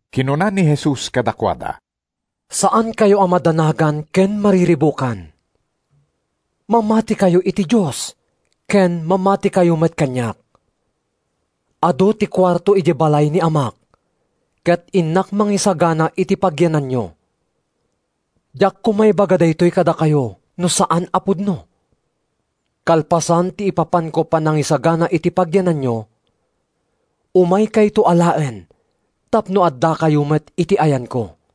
Kinuna ni Jesus kadakuada: “Saankayo a madanagan ken mariribukan. Mamatikayo iti Dios, ken mamatikayo met kaniak. Adu ti kuarto idiay balay ni Amak, ket innak mangisagana iti pagyananyo. Diak koma ibaga daytoy kadakayo no saan a pudno. Kalpasan ti ipapanko panangisagana iti pagyananyo, umaykayto alaen tapno addakayo met iti ayanko.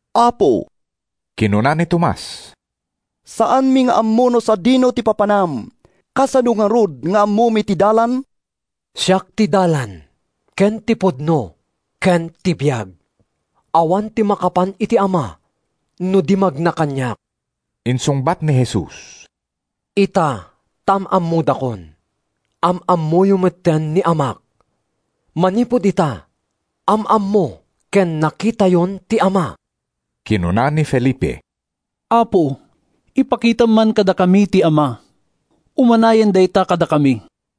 “Apo,” kinuna ni Tomas, “saanmi nga ammo no sadino ti papanam. Kasano ngarud nga ammomi ti dalan?” “Siak ti dalan, ken ti pudno, ken ti biag; awan ti makapan iti Ama no di magna kaniak,” insungbat ni Jesus. “Ita, ta am-ammodakon, am-ammoyo metten ni Amak. Manipud ita, am-ammo ken nakitayon ti Ama.” Kinuna ni Felipe, “Apo, ipakitam man kadakami ti Ama; umanayen dayta kadakami.”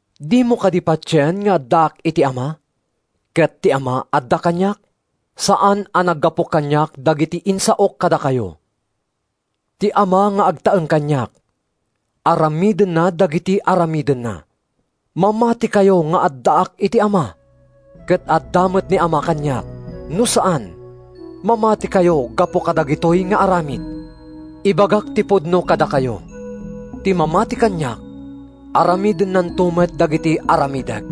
Dimo kad patien nga addaak iti Ama ket ti Ama adda kaniak? Saan a naggapu kaniak dagiti insaok kadakayo. Ti Ama nga agtaeng kaniak, aramidenna dagiti aramidna. Mamatikayo nga addaak iti Ama ket adda met ni Ama kaniak; no saan, mamatikayo gapu kadagitoy nga aramid. Ibagak ti pudno kadakayo: Ti mamati kaniak, aramidennanto met dagiti aramidek;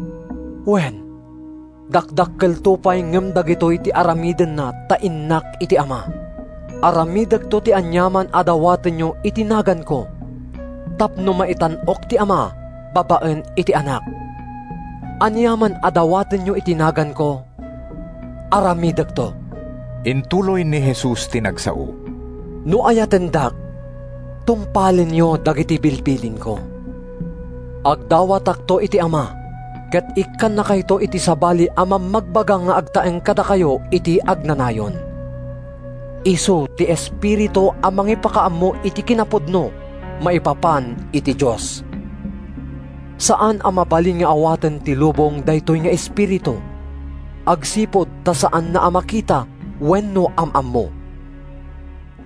wen, dakdakkelto pay ngem dagitoy ti aramidenna ta innak iti Ama. Aramidekto ti aniaman a dawatenyo iti naganko tapno maitan-ok ti Ama babaen iti Anak. Aniaman a dawatenyo iti naganko, aramidekto.” Intuloy ni Jesus ti nagsao: “No ayatendak, tungpalenyo dagiti bilbilinko. Agdawatakto iti Ama ket ikkannakayto iti sabali a Mammagbaga nga agtaeng kadakayo iti agnanayon. Isu ti Espiritu a mangipakaammo iti kinapudno maipapan iti Dios. Saan a mabalin nga awaten ti lubong daytoy nga Espiritu, agsipud ta saanna a makita wenno am-ammo.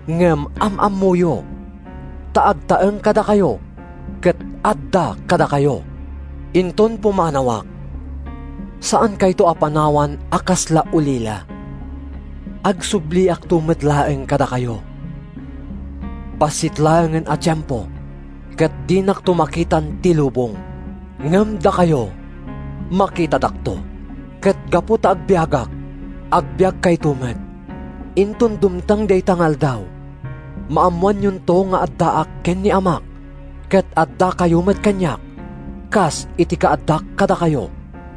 Ngem am-ammoyo, ta agtaeng kadakayo ket adda kadakayo. “Inton pumanawak, saankayto a panawan a kasla ulila. Agsubliakto met laeng kadakayo. Bassit laengen a tiempo ket dinakto makitan ti lubong, ngem dakayo, makitadakto. Ket gapu ta agbiagak, agbiagkayto met. Inton dumteng dayta nga aldaw, maammoanyonto nga addaak ken ni Amak, ket addakayo met kaniak, kas iti kaaddak kadakayo.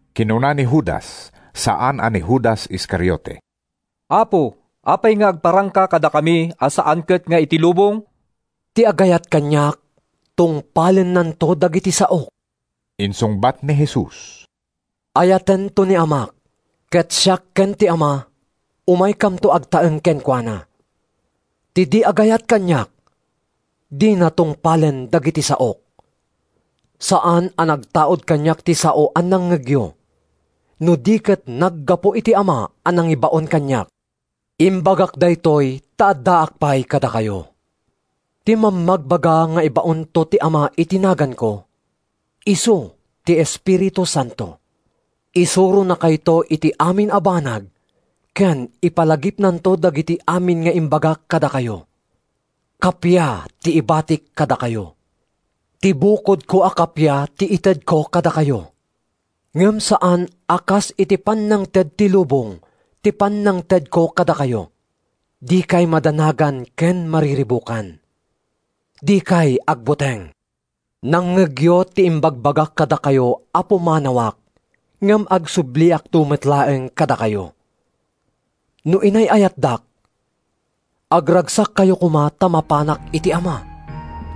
Kinuna ni Judas (saan a ni Judas Iscariote), “Apo, apay nga agparangka kadakami a saan ket nga iti lubong?” “Ti agayat kaniak, tungpalennanto dagiti saok,” insungbat ni Jesus. “Ayatento ni Amak, ket siak ken ti Ama umaykamto agtaeng kenkuana. Ti di agayat kaniak, dina tungpalen dagiti saok. Saan a nagtaud kaniak ti sao a nangngegyo, no di ket naggapu iti Ama a nangibaon kaniak. “Imbagak daytoy ta addaak pay kadakayo. Ti Mammagbaga nga ibaonto ti Ama iti naganko, isu ti Espiritu Santo. Isuronakayto iti amin a banag ken ipalagipnanto dagiti amin nga imbagak kadakayo. “Kappia ti ibatik kadakayo. Ti bukodko a kappia ti itedko kadakayo. Ngem saan a kas iti pannangted ti lubong ti pannangtedko kadakayo. Dikay madanagan ken mariribukan. Dikay agbuteng. Nangngegyo ti imbagbagak kadakayo a pumanawak ngem agsubliakto met laeng kadakayo. No inay-ayatdak, agragsakkayo koma ta mapanak iti Ama,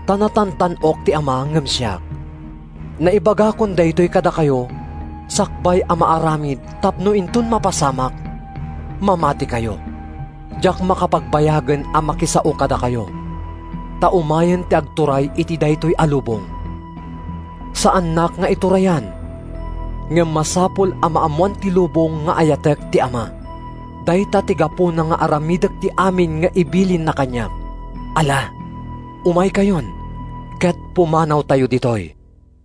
ta natantan-ok ti Ama ngem siak. Naibagakon daytoy kadakayo sakbay a maaramid tapno inton mapasamak, mamatikayo. Diak makapagbayagen a makisao kadakayo, ta umayen ti agturay iti daytoy a lubong. Saannak nga iturayan, ngem masapul a maammoan ti lubong nga ayatek ti Ama. Dayta ti gapuna nga aramidek ti amin nga ibilinna kaniak. “Ala, umaykayon ket pumanawtayo ditoy.”